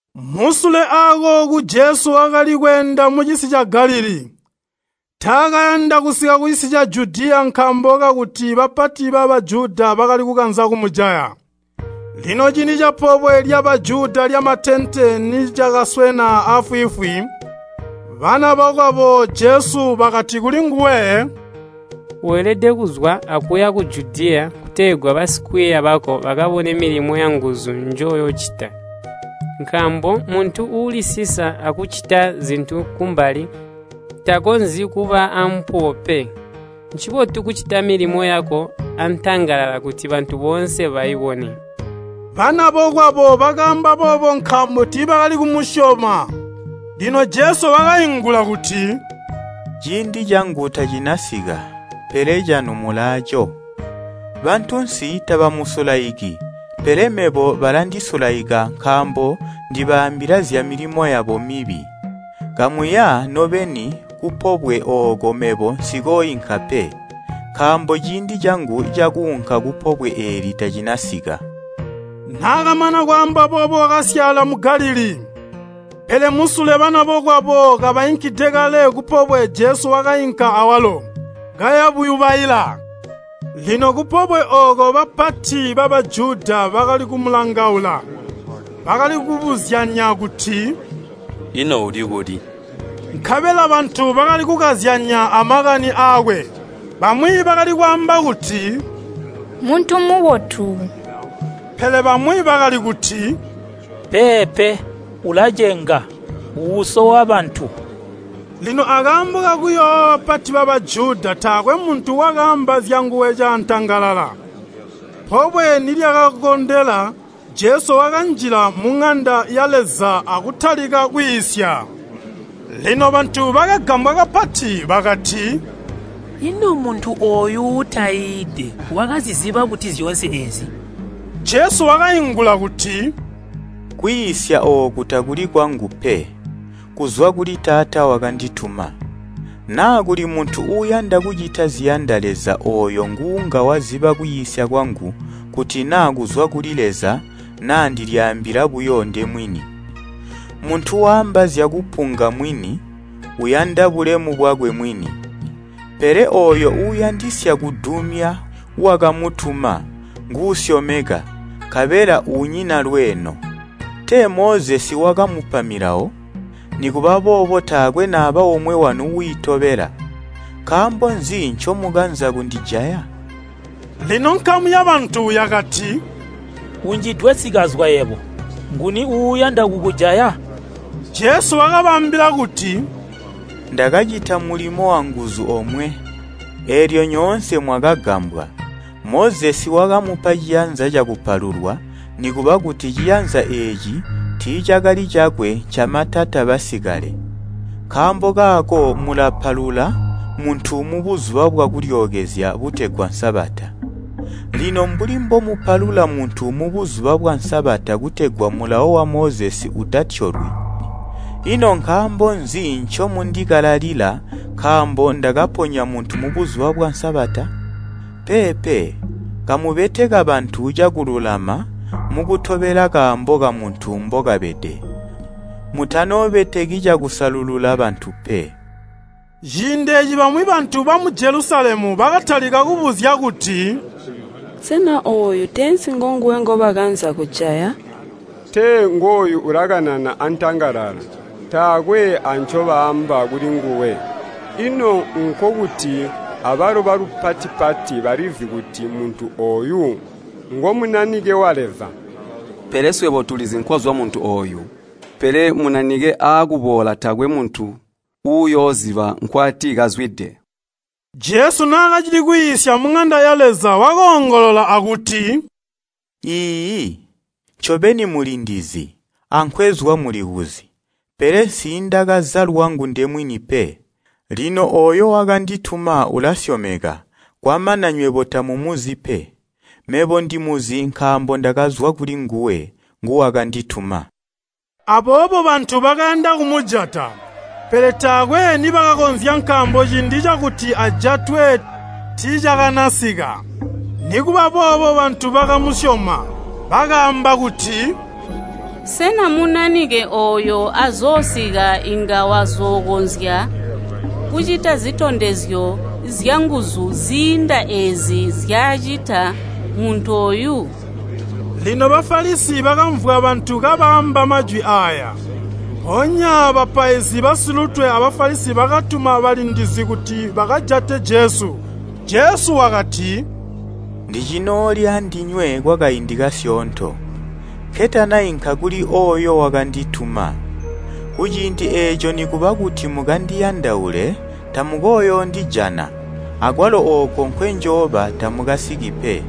Musule akooku Jesu wakali kweenda mucisi ca Galilii. Taakayanda kusika kucisi ca Judiya nkaambo kakuti bapati ba Bajuda bakali kukanza kumujaya. Lino ciindi capobwe lya Bajuda lyamatente nicakaswena aafwiifwi, bana bokwabo Jesu bakati kulinguwe, “Weelede kuzwa akuya ku Judiya kutegwa basikwiiya bako bakabone milimo yanguzu njoyoocita. Nkaambo muntu uulisisa akucita zintu kumbali takonzyi kuba aampuwo pe. Ncibotu kucita milimo yako antangalala kuti bantu boonse baibone.” Banabokwabo bakaamba boobo nkaambo tiibakali kumusyoma. Lino Jesu wakaingula kuti, “Ciindi cangu tacinasika, pele canu mulaaco. Bantunsi tabamusulaiki, pele mebo balindisulide nkaambo ndibaambila zyamilimo yabo mibi. Kamuya nobeni kupobwe ooko mebo nsikooinka pe, nkaambo ciindi cangu cakuunka kupobwe eeli tacinasika.” Naakamana kwaamba boobo wakasyaala mu Galilii. Pele musule banabokwabo kabainkide kale kupobwe Jesu wakainka awalo, kaya buyubaila. Lino kupobwe ooko bapati ba Bajuda bakali kumulangaula. Bakali kubuzyanya kuti, “Ino uli kuli?” Nkabela bantu bakali kukazyanya amakani aakwe. Bamwi bakali kwaamba kuti, “Mmuntu mubotu.” Pele bamwi bakali kuti, “Peepe, ulacenga, uusowa bantu.” Lino akaambo kakuyoowa bapati ba Bajuda taakwe muntu wakaamba zyanguwe caatangalala. Pobwe nilyakakondela, Jesu wakanjila muŋanda ya Leza akutalika kwiisya. Lino bantu bakagambwa kapati bakati, “Ino muntu ooyu uutaiide wakaziziba buti zyoonse eezi?” Jesu wakaingula kuti, “Kwiisya ooku takuli kwangu pe, kuzwa kuli Taata wakandituma. Naa kuli muntu uuyanda kucita ziyanda Leza ooyo nguunga waziba kwiisya kwangu kuti naa kuzwa kuli Leza, naa ndilyaambila buyo ndemwini. Muntu waamba zyakupunga mwini, uyanda bulemu bwakwe mwini. Pele ooyo uuyandisya kudumya wakamutuma, nguusyomeka, nkabela unyina lweeno. Tee Mozesi wakamupa Milawo? Nikuba boobo taakwe naba omwe wanu wiitobela. Nkaambo nzi ncomukanza kundijaya?” Lino nkamu yabantu yakati, “Unjidwe sikazwa yebo. Nguni uuyanda kukujaya?” Jesu wakabaambila kuti, “Ndakacita mulimo wanguzu omwe, eelyo nyoonse mwakagambwa. Mozesi wakamupa ciyanza cakupalulwa (nikuba kuti ciyanzya eeci tiicakali cakwe ncamatata basikale). Nkaambo kaako mulapalula muntu mu Buzuba bwa Kulyookezya butegwa Sabata. Lino mbuli mbomupalula muntu mu Buzuba bwa Sabata kutegwa mulawo wa Mozesi utatyolwi, ino nkaambo nzi ncomundikalalila nkaambo ndakaponya muntu mu Buzuba bwa Sabata? Peepe, kamubeteka bantu cakululama mukutobela kaambo kamuntu mbokabede. Mutanoobeteki cakusalulula bantu pe.” Ciindi eeci bamwi bantu bamu Jelusalemu bakatalika kubuzya kuti, “Sena ooyu teensi ngonguwe ngobakanza kujaya? Tee ngooyu ulakanana antangalala, taakwe ancobaamba kulinguwe. Ino nkokuti abalo balupati-pati balizi kuti muntu ooyu ngo Munanike wa Leza. Pele swebo tulizi nkwazwa muntu ooyu, pele Munanike aakuboola taakwe muntu uyooziba nkwatikazwide.” Jesu naakacili kwiisya muŋanda ya Leza, wakoongolola akuti, “Iiyi, ncobeni mulindizi, ankwezwa mulikuzi, pele nsiindakaza lwangu ndemwini pe. Lino ooyo wakandituma ulasyomeka, kwamana nywebo tamumuzi pe. Mebo ndimuzi nkaambo ndakazwa kulinguwe, nguwakandituma.” Aboobo bantu bakayanda kumujata, pele taakwe nibakakonzya nkaambo ciindi cakuti ajatwe tiicakanasika. Nikuba boobo bantu bakamusyoma, bakaamba kuti, “Sena Munanike ooyo azoosika inga azookonzya kucita zitondezyo zyanguzu ziinda eezi nzyacita muntu ooyu?” Lino Bafalisi bakamvwa bantu kabaamba majwi aaya. Mpoonya bapaizi basilutwe a Bafalisi bakatuma balindizi kuti bakajate Jesu. Jesu wakati, “Ndicinooli andinywe kwakaindi kasyoonto, nketanainka kuli ooyo wakandituma. Kuciindi eeco nikuba kuti mukandiyandaule tamukooyoondijana, akwalo ooko nkwenjooba tamukasiki pe.”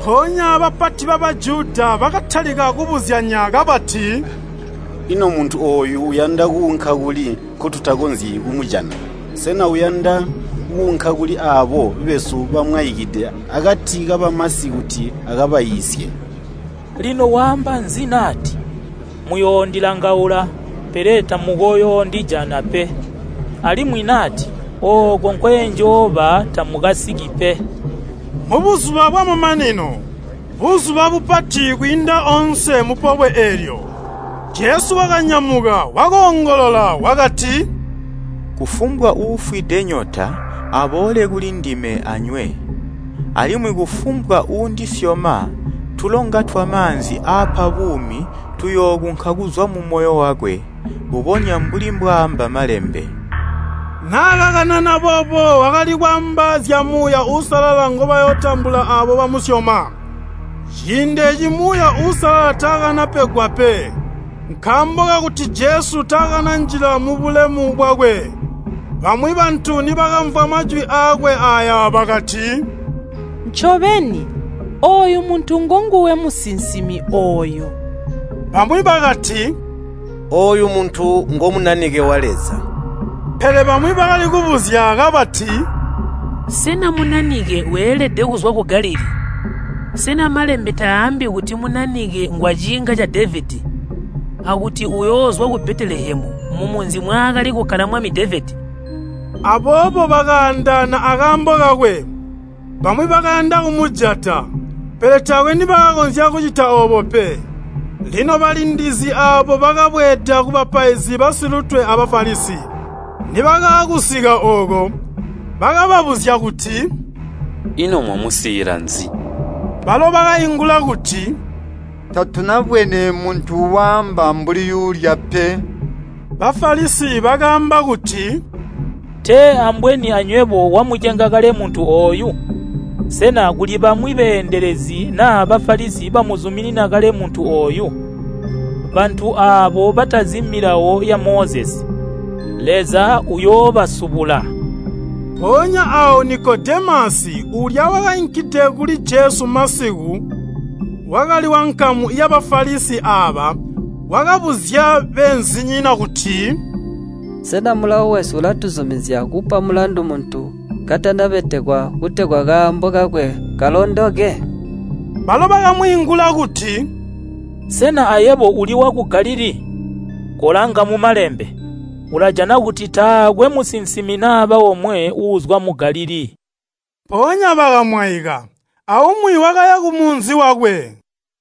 Mpoonya bapati ba Bajuda bakatalika kubuzyanya kabati, “Ino muntu ooyu uyanda kuunka kuli nkotutakonzyi kumujana? Sena uyanda kuunka kuli aabo besu bamwaikide akati kabamasi kuti akabaiisye? Lino waamba nzi nati, ‘Muyoondilangaula, pele tamukooyoondijana pe!’ alimwi nati, ‘Ooko nkwenjooba tamukasiki pe?’” Mubuzuba bwamamanino, buzuba bupati kwiinda oonse mupobwe eelyo, Jesu wakanyamuka, wakoongolola wakati, “Kufumbwa uufwide nyota, aboole kulindime anywe. Alimwi ‘Kufumbwa uundisyoma, tulonga twamaanzi aapa buumi tuyookunka kuzwa mumoyo wakwe,’ mbubonya mbuli mbwaamba Malembe.” Naakakanana boobo wakali kwaamba zya Muuya Uusalala ngobayootambula aabo bamusyoma. Ciindi eeci Muuya Uusalala taakanapegwa pe, nkaambo kakuti Jesu taakananjila mubulemu bwakwe. Bamwi bantu nibakamvwa majwi aakwe aaya bakati, “Ncobeni, ooyu muntu ngonguwe musinsimi ooyo.” Bamwi bakati, “Ooyu muntu ngo Munanike wa Leza.” Pele bamwi bakali kubuzya kabati, “Sena Munanike weelede kuzwa ku Galilii? Sena Malembe taambi kuti Munanike ngwaciinga ca Devedi, akuti uyoozwa ku Betelehemu, mumunzi mwaakali kukkala mwami Devedi?” Aboobo bakaandaana akaambo kakwe. Bamwi bakayanda kumujata, pele taakwe nibakakonzya kucita oobo pe. Lino balindizi aabo bakabweeda kubapaizi basilutwe a Bafalisi. Nibakaakusika ooko, bakababuzya kuti, “Ino mwamusiila nzi?” Balo bakaingula kuti, “Tatunabwene muntu waamba mbuli yuulya pe!” Bafalisi bakaamba kuti, “Tee ambweni anywebo wamucenga kale muntu ooyu? Sena kuli bamwi beendelezi na Bafalisi bamuzuminina kale muntu ooyu? Bantu aabo batazi Milawo ya Mozesi, Leza uuyoobasubula.” Mpoonya aawo Nikodemasi, uulya wakainkide kuli Jesu masiku, wakali wankamu ya Bafalisi aaba, wakabuzya beenzinyina kuti, “Sena mulawo wesu ulatuzumizya kupa mulandu muntu katanabetekwa kutegwa kaambo kakwe kalondoke?” Balo bakamwiingula kuti, “Sena ayebo uli waku Galilii? Kolanga mu Malembe, ulajana kuti taakwe musinsimi naba omwe uuzwa mu Galilii.” [ Mpoonya bakamwaika, aumwi wakaya kumunzi wakwe.